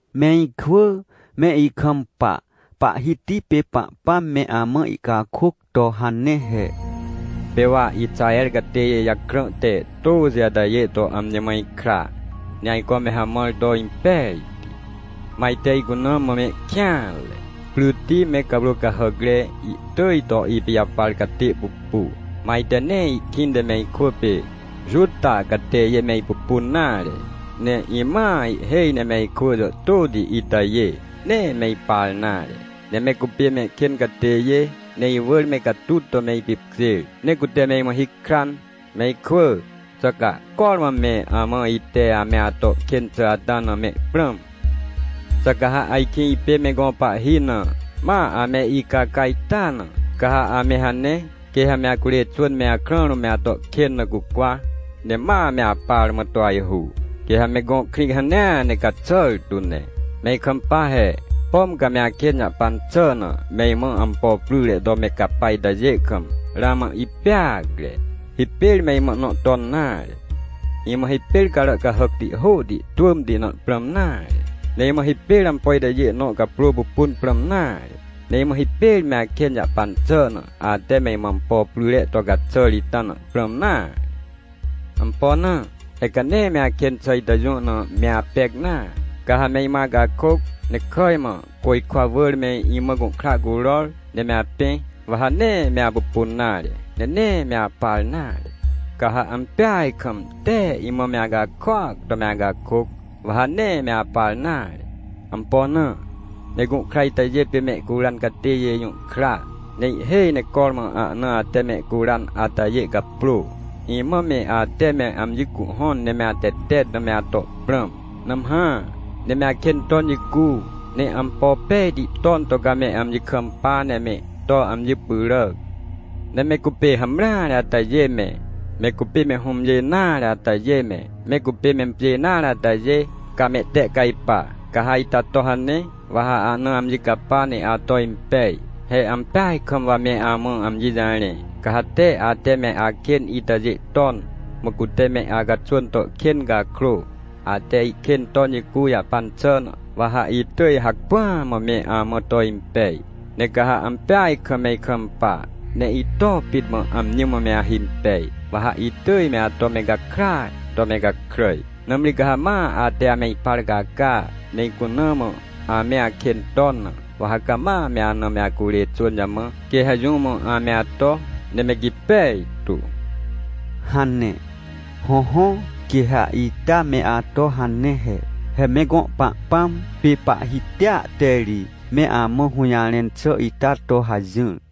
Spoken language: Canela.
Me ikwỳ, me ikampa! Pahhiti pê Pahpãm me amã ihcakôc to hane he: “Pê wa Ixaher catêjê jakrã te tôxi atajê to amji mã ikra, ne ajco me hamãr to impejti. Mã ajte icuna mã mehkêanre. Pryti me cawrô cahàcre, ihtỳj to ipijaparcatê pupu. Mã ajte nee ihkĩnte me ikwỳ pê Juta catêjê me ipupun nare. Ne imãa ihhêj ne me ikwỳ jàhtôti itajê, nee me ipar nare. Ne mecupê mehkên catêjê, ne iwỳr me catut to me ipipkjêr, ne cute me imã hikran. “Me ikwỳ, xà ca cormã me amã ite ame atokên xà ata na me prãm? Xà ca ha ajkĩ ipê me gõ pahhina, ma ame icaca ita na? Ca ha amehane, quê ha me acurê xwỳn me akrã rũm me ato kên na cucwa, ne ma meapar mã to ajhu. Quê ha me gõ krĩ hanea ne caxàr tu ne. “Me ikampa he: Pom ca me akên jahpan xà na, me imã ampo pryre to me capaitajê kam, ramã ipeacre. Hipêr me imã ihnõ ton nare. Imã hipêrcarà cahàcti hôhti twỳmti na prãm nare. Ne imã hipêr ampo itajê nõcaprô pupun prãm nare. Ne imã hipêr me akên jahpan xà na, ate me imãampo pryre to caxàr ita na prãm nare. Ampo na? He ca nee me akên xàitajê jũ na me apec nare. “Ca ha me imã acakôc, ne kàj mã côjkwa wỳrme imã gũhkra curor, ne me apẽ, wa ha nee me apupun nare, ne nee me aparnare. Ca ha ampeaj kam, tee imã me acakôac to me acakôc, wa ha nee me aparnare. Ampo na? Me gũhkra itajê pê mehcuran catêjê jũhkra. Ne ihhêj necormã ahna ate mehcuran atajê caprô. “Imã me ate me amji cuhhõn ne me atetet na me ato prãm. Nãmhã, ne meakên ton jicu. Ne ampo pejti ton to ca me amji kampa, ne me to amji pyràc. Ne me cupê hamreare atajê me, me cupê me hũmjê nare atajê me, me cupêmempjê nare atajê, ca mehtehcajpa. “Ca ha ita to hane, wa ha ana amjicapa ne ato impej. He ampeaj kam wa me amã amji jarẽ. Caha te ate me akên itajê ton, mã cute me acaxwỳn to kên cakrô, ate ihkên ton jicu jahpan xà na, wa haitỳj hacpỹa mã me amã to impej. Ne ca ha ampeaj kam me ikampa, ne ito pit mã amji mã me ahimpej, wa ha itỳj me ato me gakràaj to me gakràj. “Nãmri ca ha ma ate ame ipar caca, ne icuna mã ame akên ton na, wa ha cama meana me acurê xwỳn jamã, quê ha jũ mã ame ato, ne me gipej tu” hane. Hõhõ, quê ha ita me ato hane he. He me gõ Pahpãm, pê Pahhitia te ri me amã hũjarẽn xà ita to hajỹr.